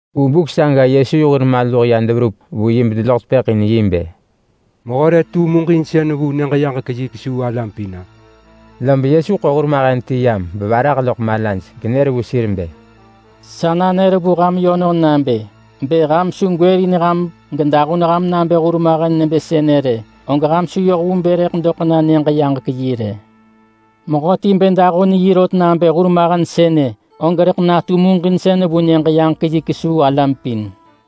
Vu buk saga Yesu yi hur maluh ya deverup vu yi bedeloḳ tepëḳ in yi bë, “Mehö re tu muġinsën vu Nyëġ-yaġek-yi kesuu alam pin-a?” Lob Yesu ḳo hurmahen ti yam bevarah loḳ malaj, genër vu sir bë, “Sa nanër vu ham yönon nabë: Bë ham su gwërin ham gedahun ham nabë hurmahen nebë sënë rë, og ham su yoh vu bë rëḳ doḳ na Nyëġ-yaġek-yi rë. Mehöti bë dahun yi rot nabë hurmahen sënë, og rëḳ natu muġinsën vu Nyëġ-yaġek-yi kesuu alam pin.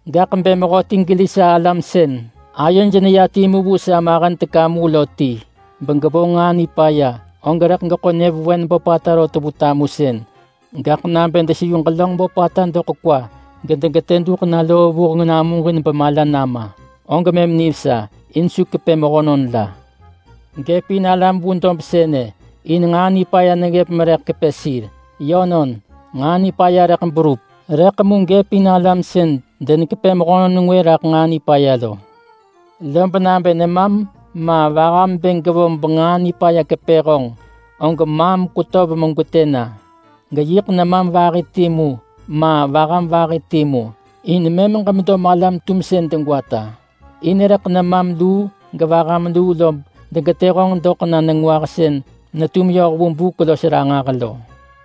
“Gaḳ bë mehöti geli sa alam sën ayoj neya timu vu sa mahen teka mu lo ti, begevonġ nġaa nipaya, og rëḳ geḳo nyëvewen böpata rot vu tamusën, gaḳ nabë deseyu ġelönġ böpata doḳ kwa gedegetë duḳ na loo vuheng namuġin bemala nama, og mëm nivesa, in su kepë mehönon la. Gëp in alam vu dob sënë in nġaa nipaya neggëp merëḳ kepë sir. Yönon! Nġaa nipaya rëḳ berup, rëḳ mu gëp in alam sën denekepë mehönon ngwë raḳ nġaa nipaya lo. Lob nabë nemam ma vaham bë gevonġ benġaa nipaya kepë honġ, og maam kwetöv megwetë na. Geyiḳ nemam vahi timu ma vaham vahi timu, in mëm ġemedo malam-tumsën degwata. In rëḳ nemam luu gevaham luu lob degetë honġ doḳ na nengwah sën netum yoh vu buk los ranġah lo.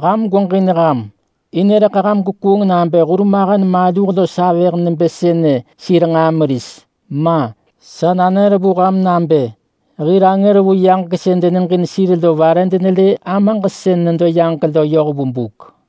“Ham gweġin ham! In rëḳ ham gwekuung nabë hurmahen maluh los avëh nebë sënë sir nġaa meris. Ma! Sa nanër vu ham nabë hir angër vu yaġek sën deneġin sir lo vare denelë Amaġ sën nedo yaġek lo yoh vu buk.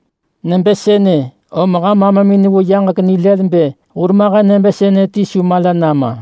Nebë sënë, om ham Amamin vu yaġek nilël bë hurmahen nebë sënë ti su mala nama.”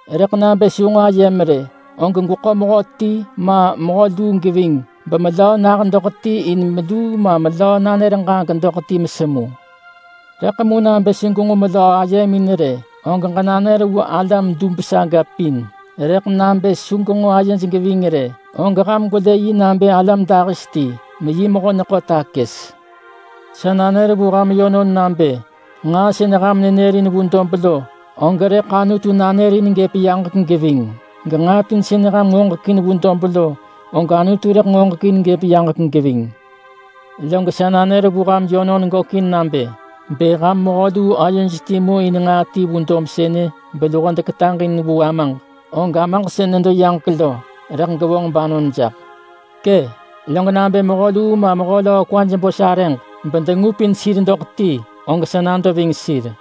Rëḳ nabë su nġo ayem rë, og gweḳo mehöti ma mehö luu geving bemelöö nah doḳ ti in meluu ma melöö nanër ġaġek ranġah, og mëm ham rëḳ semu. Rëḳ nabë su nġo melöö ayemin rë, og ġenanër vu sa alam pin. Rëḳ nabë su genġo sa alam ayej geving rë, og ham gwelë yi nabë yi alam-yu-ngwë ti, meyi mehö-neḳo-takës. Sa nanër vu ham yönon nabë nġaa sën ham nanërin vu dob lo, og rëḳ Anutu nanërin gëp yaġek geving. Genġaa pin sën ham ngoġekin vu dob lo, og Anutu rëḳ ngoġekin gëp yaġek geving. Log sa nanër vu ham yönon gökin nabë: Bë ham mehö luu ayoj timu in nġaa ti vu dob sënë beluho deketaġ in vu Amaġ, og Amaġ sën nedo yaġek lo, rëḳ gevonġ banon jaḳ. Kë, log nabë mehö luu ma mehö löö kwaj bo sarëġ bedengupin sir doḳ ti, og sëḳ nam medo geving sir.”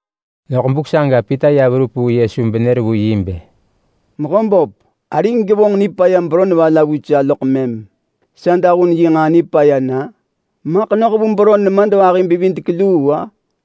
Loḳ buk saga Pita ya verup vu Yesu benër vu yi bë, “Mehöböp, arig gevonġ nipaya beron va la vu sa loḳ mëm sa dahun yi nġaa nipaya na? Maḳ noh vu beron nemadvahi-bevidek-luu-a?”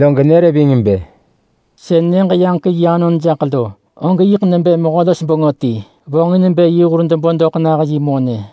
Log nër ving bë, “Sën Nyëġ-yaġek-yi anon jaḳ lo, og yiḳ nebë mehö-los-bengö ti vonġin bë yi hur debo doḳ nah yi monë.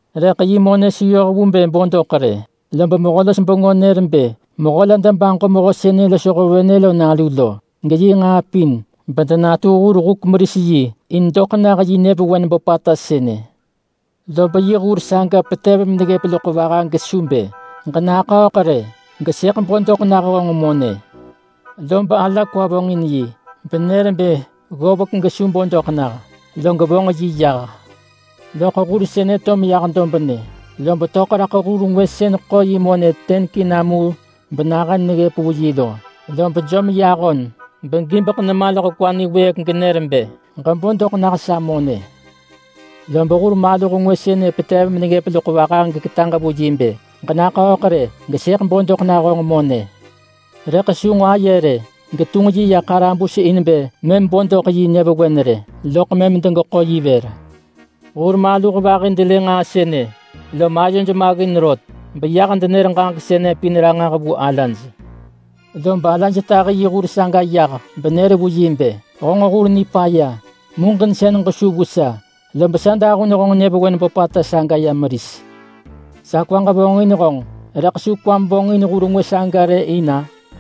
Rëḳ yi monë su yoh vu bë bo doḳ rë. Lob mehö-los-bengö nër bë mehö la debaġo mehö sënë losho venë lo nalu lo, geyi nġaa pin, bedenatu hur-huk-meris-yi in doḳ nah yi nyëvewen böpata sënë. Lob yi hur maluh saga petev meneggëp loḳ vaha gesu bë, ‘Ġenaḳööḳ rë, rëḳ mëm sëḳ bo doḳ nah honġ monë!’ Lob ala kwa vonġin yi, benër bë ggovek gesu bo doḳ nah, log vonġ yi yah. Lob hur maluh sënë to meya dobnë, lob töḳ raḳ hur maluh ngwë sën vo yi monë yiḳ mahen mu vu wirek yoh vu K100 benyëvewen nahën neggëp vu yi lo. Lob jom yi ahon niwëëk begibek nema loḳ kwa genër bë, ‘Ġebo doḳ nah sa monë!’ Lob hur maluh ngwë sënë petev meneggëp loḳ vaha geketaġ vu yi bë, ‘Ġenaḳööḳ rë, rëḳ mëm sëḳ bo doḳ nah honġ monë!’ Rëḳ su nġo aye rë, getunġ yi ya ḳarabus in bë mëm bo doḳ yi nyëvewen rë, lob mëm degeḳo yi vër. Hur maluh vahi delë nġaa sënë, lom ayoj maggin rot, lob ya denër ġaġek sënë pin ranġah vu alaj. Lob alaj tahi yi hur maluh saga yah benër vu yi bë, ‘Honġ hur nipaya! Muġinsën ġesu vu sa, lob sa dahun honġ nyëvewen böpata saga ya meris. Sa kwaġ vonġin honġ, rëḳ su kwam vonġin hur maluh ngwë saga rë in-a?’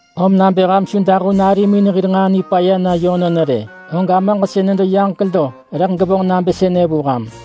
Om nabë ham su dahun arimin hir nġaa nipaya na yönon rë, og Amaġ sën nedo yaġek lo rëḳ gevonġ nabë sënë vu ham.”